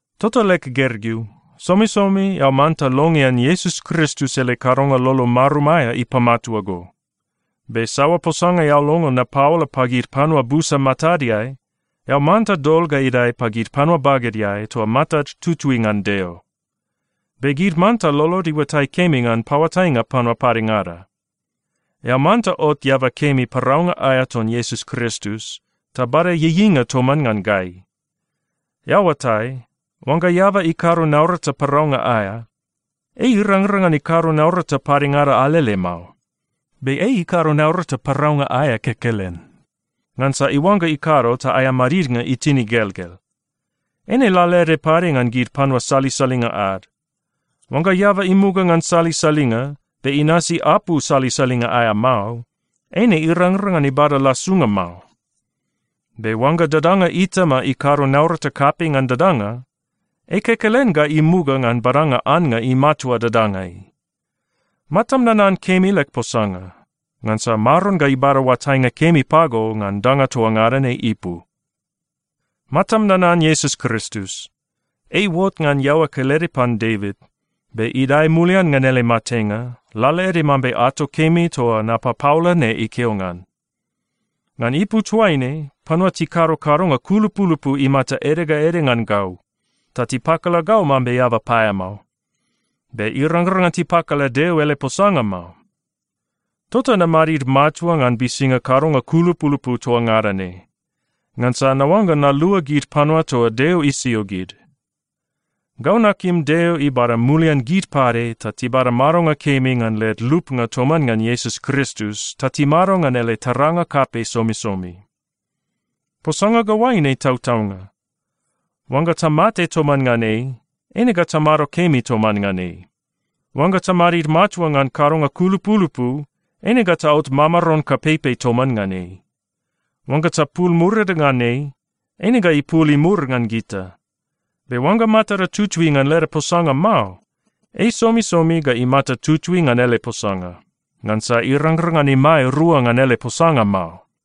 Tota leg gergeu, somisomi eao manta longean Iesus Kristus ele kadonga lolo marum aea ipamatua go. Be saoa posanga eao longo napaola pagid panua busa matadeai, eao manta dol ga idae pagid panua bagedeai toa matad tutui ngan Deo. Be gid manta lolod iuatai kemi ngan paoatainga panua padengada. Eao manta ot eaba kemi paraunga aea ton Iesus Kristus, ta bada ieieinga toman ngan gai. Eao oatai, oangga eaba ikado naurata paraunga aea, ei irangrang ngan ikado naurata padengada alele mao. Be ei ikado naurata paraunga aea kekelen, ngansa iuangga ikado ta aea madidnga itin igelgel. Eine lalaede pade ngan gid panua salisalinga ad. Oangga eaba imuga ngan salisalinga, be inasi apu salisalinga aea mao, eine irangrang ngan ibada lasunga mao. Be oangga dadanga itama ikado naurata kapei ngan dadanga, ei kekelen ga imuga ngan badanga annga imatua dadangai. Matam nanan kemi leg posanga, ngansa Maron ga ibada oatainga kemi pago ngan danga toa ngada ne ipu. Matam nanan Iesus Kristus. Ei iuot ngan iaoa kelede pan Devit, be idae mulian ngan ele matenga, lalaede mambe ato kemi toa napapaola ne ikeo ngan. Ngan ipu toaine, panua tikado kadonga kulupulupu imata ede ga ede ngan gau, ta tipakala gau mambe eaba paeamao. Be irangrang ngan tipakala Deo ele posanga mao. Tota namadid matua ngan bisinga kadonga kulupulupu toa ngada ne, ngansa naoangga nalua gid panua toa Deo isio gid. Gau nakim Deo ibada mulian gid pade ta tibada madonga kemi ngan led lupnga toman ngan Iesus Kristus ta timado ngan ele taranga kapei somisomi. Posanga ga oaine tautaunga: Oangga tamate toman ngan ei, eine ga tamado kemi toman ngan ei. Oangga tamadid matua ngan kadonga kulupulupu, eine ga taot mamaron kapeipei toman ngan ei. Oangga tapul murida ngan ei, eine ga ipul imur ngan gita. Be oangga matada tutui ngan leda posanga mao, ei somisomi ga imata tutui ngan ele posanga, ngansa irangrang ngan imae rua ngan ele posanga mao.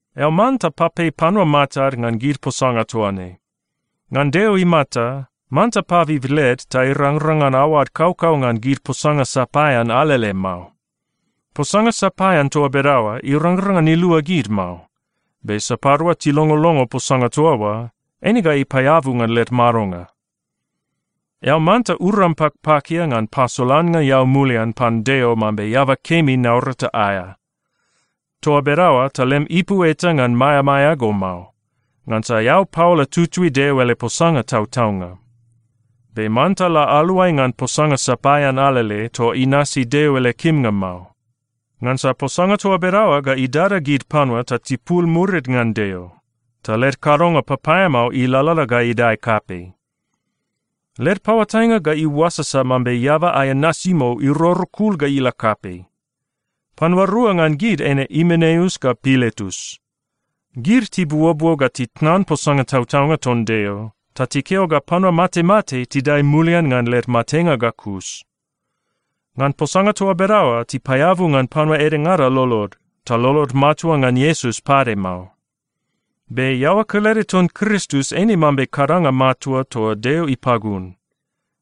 Eao manta papei panua matad ngan gid posanga toa ne. Ngan Deo imata, manta pabib led ta irangrang ngan aoad kaukau ngan gid posanga sapaean alele mao. Posanga sapaean toa bedaoa irangrang ngan ilua gid mao, be sapadua tilongolongo posanga toa oa, eine ga ipaeabu ngan led madonga. Eao manta uram pakpakia ngan pasolannga eao mulian pan Deo mambe eaba kemi naurata aea. Toa bedaoa ta lem ipu eta ngan maeamaea go mao, ngansa eao paola tutui Deo ele posanga tautaunga. Be manta la aluai ngan posanga sapaean alele toa inasi Deo ele kimnga mao, ngansa posanga toa bedaoa ga idada gid panua ta tipul murid ngan Deo, ta led kadonga papaeamao ilalala ga idae kapei. Led paoatainga ga iuasasa mambe eaba aea nasimou irorokul ga ila kapei. Panua rua ngan gid eine Imeneus ga Piletus. Gid tibuobuo ga titnan posanga tautaunga ton Deo, ta tikeo ga panua matemate tidae mulian ngan led matenga ga kus. Ngan posanga toa bedaoa tipaeabu ngan panua edengada lolod, ta lolod matua ngan Iesus pade mao. Be iaoa kelede ton Kristus eine mambe kadanga matua toa Deo ipagun,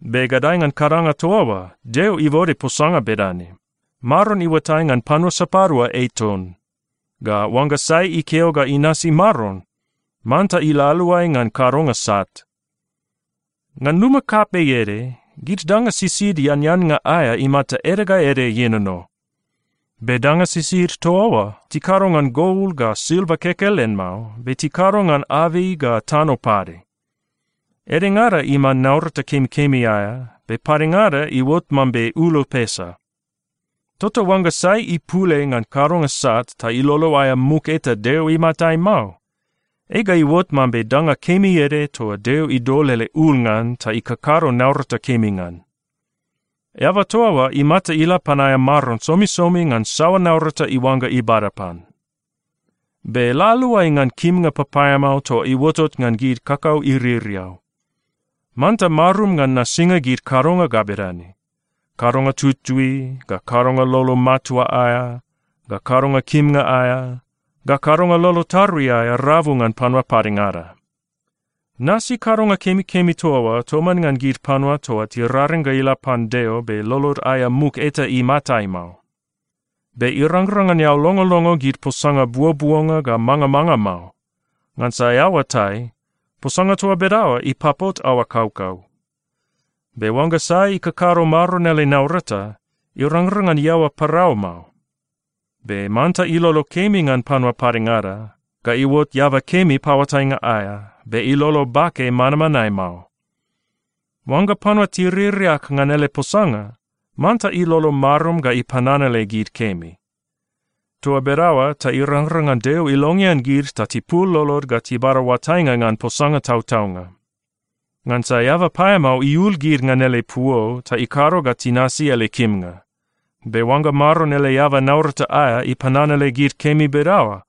be gadae ngan kadanga toa oa Deo ibode posanga bedane, “Maron iuatai ngan panua sapadua ei ton,” ga “Oangga sai ikeo ga inasi Maron, manta ila aluai ngan kadonga sat.” Ngan luma kapei ede, gid danga sisid eaneannga aea imata ede ga ede ienono. Be danga sisid toa oa, tikado ngan gol ga silva kekelen mao, be tikado ngan abei ga tano pade. Edengada iman naurata kemikemi aea, be padengada iuot mambe ulo pesa. Tota oangga sai ipul ei ngan kadonga sat ta ilolo aea muk eta Deo imatai mao, ei ga iuot mambe danga kemi ede toa Deo idol ele ul ngan ta ikakado naurata kemi ngan. Eaba toa oa imata ila pan aea Maron somisomi ngan saoa naurata iuangga ibada pan. Be la aluai ngan kimnga papaeamao toa iuotot ngan gid kakau iririau. Manta marum ngan nasinga gid kadonga ga bedane: kadonga tutui, ga kadonga lolo matua aea, ga kadonga kimnga aea, ga kadonga lolo tarui aea rabu ngan panua padengada. Nasi kadonga kemikemi toa oa toman ngan gid panua toa tiraring ga ila pan Deo be lolod aea muk eta imatai mao. Be irangrang ngan eao longolongo gid posanga buobuonga ga mangamanga mao, ngansa eao oatai, posanga toa bedaoa ipapot aoa kaukau. Be oangga sai ikakado Maron ele naurata, irangrang ngan iaoa parau mao. Be manta ilolo kemi ngan panua padengada, ga iuot eaba kemi paoatainga aea, be ilolo bake manmanae mao. Oangga panua tiririak ngan ele posanga, manta ilolo marum ga ipananale gid kemi. Toa bedaoa ta irangrang ngan Deo ilongean gid ta tipul lolod ga tibada oatainga ngan posanga tautaunga. Ngansa eaba paeamao iul gid ngan ele puo ta ikado ga tinasi ele kimnga. Be oangga Maron ele eaba naurata aea ipananale gid kemi bedaoa,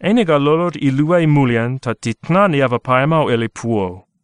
eine ga lolod iluai mulian ta titnan eaba paeamao ele puo.